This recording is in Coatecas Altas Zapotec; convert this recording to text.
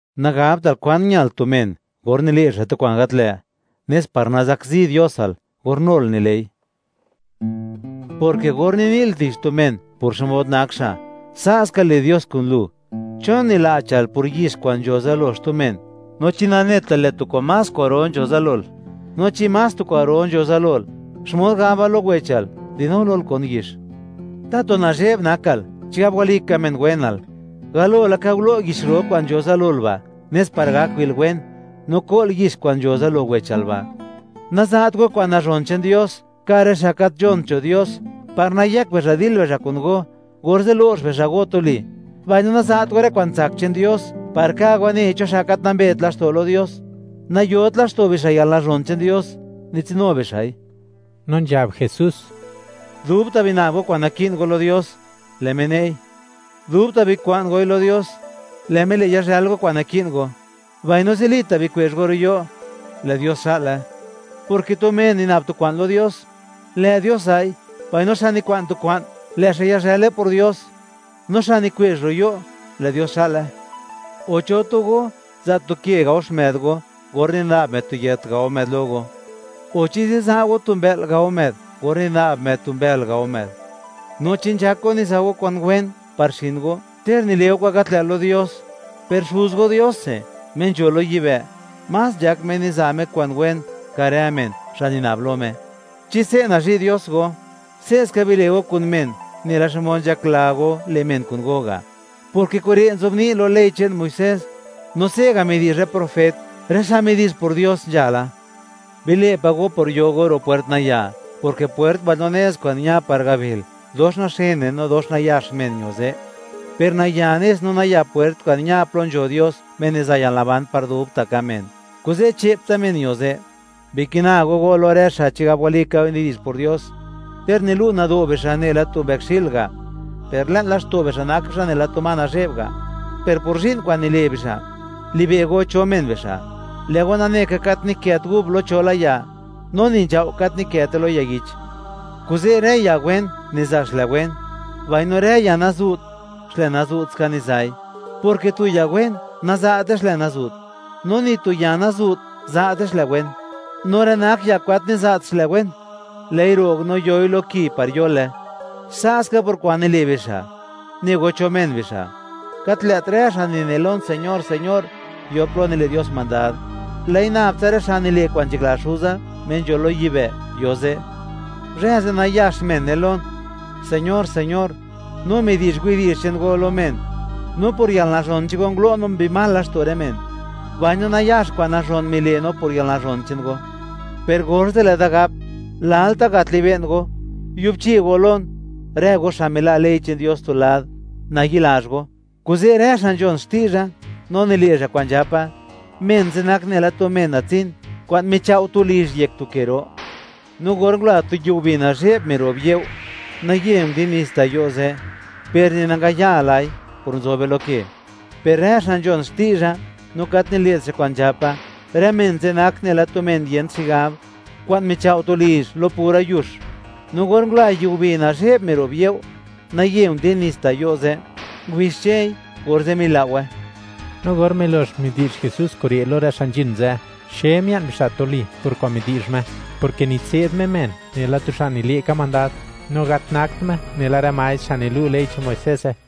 ’Nagabtal kwan ñal tu men or nile' xa' tu kwa'n gat lë', nes par nazakzi Diosal or nul nile'i, porke or nini'l tich tu men por xmod nak xa', sa' ska le' Dios kun lu. ¿Chon nila'chal por yix kwa'n nzho zalo xtu men, no chi nanetal, lë' tu kwa'n más kwa'ro nzho zalol? No chi más tu kwa'ro nzho zalol, ¿xmod gabal lo wechal: “Dinu lol, kon yix”? ¡Tatu nazhe'b nakal, chigab walika men wenal! Galo laka gulo' yix ro kwa'n nzho lol ba', nes par gak wi'l wen no ko'l yix kwa'n nzho zalo wechal ba'. ’Naza't go kwa'n nazhon che'n Dios ka' rë xa' gat nzhont nzho Dios, par nayëk bixa' dil bixa' kun go, orze' lo'x bixa' go tuli. Mbaino naza't go rë kwa'n tsak che'n Dios par ka' wanei cho xa' gat nambet laxto' lo Dios; nayot laxto' bixa' yalnazhon che'n Dios, nitsinu bixa'i. No nzhab Jesús: ―Dubta' bina'b go kwa'n naki'n go lo Dios, lë' Me ne'i; dubta' bikwa'n goi lo Dios, lë' Me le' yazhël go kwa'n naki'n go; mbaino zilita' bikwe'zh go ro' yo', lë' Dios xa'le, porke tu men nina'b tu kwa'n lo Dios, lë' Dios za'i; mbaino xa' nikwa'n tu kwa'n, lë' xa' yazhële por Dios; no xa' nikwe'zh ro' yo', lë' Dios xa'le. O, ¿cho tu go, za' tu ke gao xmë'd go or nina'b më'd tu yët gao më'd lo go?; o, ¿chi ziza' go tu mbë'l gao më'd or nina'b më'd tu mbël gao më'd? No chi nzhak go niza' go kwa'n wen par xin go ter nile' go kwa'n gat lë' lo Dios, per Xuz go Diose, Me nzho lo yibë', más nzhak Me niza' Me kwa'n wen ka' rë men, xa' nina'be lo Me. ’Chi se' nazhi' Dios go, se'ska bile' go kun men, nela xmod nzhakla go le' men kun go ga'; porke kure' nzobni' lo ley che'n Muisés; no se'ga' midi'zh rë profet, rë xa' midi'zh por Dios nzhala. ’Bile' pa' go por yo go ro' puert naya, porke pwert mbaino nez kwa'n ña par gabil, dox naxene, no dox nayax men ño ze'; per naya nez no naya pwert kwa'n ña plo nzho Dios, Me niza' yalnaban par dubta' ka' men; kuze' che'ptsa men ño ze'. ’Bikina go go lo rë xa' chigab walika nidi'zh por Dios; ter nilu' nado' bixa' nela tu mbëkxi'l ga', per le'n laxto' bixa' nak bixa' nela tu ma nazhe'b ga', per por zhi'n kwa'n nile' bixa', li'be' go cho men bixa'; lë' go nane ka, gat nikët gub lo cho la ya, no ni nzhao' gat nikëte lo ya yich. Kuze' rë ya wen niza' xlë wen, mbaino rë ya nazu't, xlë nazu't ska niza'i, porke tu ya wen za'te xlë nazu't, no ni tu ya nazu't naza'te xlë wen. No rë nak ya kwa'n gat niza't xlë wen, lë'i ro'g no yoi lo ki par yole. Sa' ska por kwa'n nile' bixa', ne go cho men bixa'. ’Gat lë't rë xa' nine lon: “¡Señor, señor!”, yo plo nile' Dios mandad; lë'i nab tsa rë xa' nile' kwa'n nzhakla Xuza Me nzho lo yibë', yo ze'. Zhë ze', nayax men ne lon: “¡Señor, señor! No midi'zh widi'zh che'n go lo men, no por yalnazhon che'n go ngulo' no mbi mal laxto' rë men, mbaino nayax kwa'n nazhon mile' no por yalnazhon che'n go.” Per orze' lë'da gap: “Lalta' gat libe'n go; yubchi go lon, ¡rë go xa' mila' ley che'n Dios tu lad, nayi'lazh go!” ’Kuze', rë xa' nzhon xti'zha no nile' xa' kwa'n nzhapa, men ze' nak nela tu men natsin, kwa'n michao' tu lizh yek tu ke ro. No or ngula tu yiubi nazhe'b, miro'b you', naye ndin nits ta' yo' ze', per ni nangayalai, por nzobe lo ke. Per rë xa' nzhon xti'zha, no gat nile't xa' kwa'n nzhapa, rë men ze' nak nela tu men yent xigab kwa'n michao' tu lizh lo pura yux. No or ngula yiubi nazhe'b, miro'b you', naye ndin nits ta' yo' ze', ngubixchei, orze' milao'we. No or milox midi'zh Jesús kure' lo rë xa' nzhin ze', xe mia'n bixa' tuli por kwa'n midi'zh Me, porke nitse'd Me men nela tu xa' nile' ka mandad, no gat nakt Me nela rë maestr xa' nilu' ley che'n Moiseze.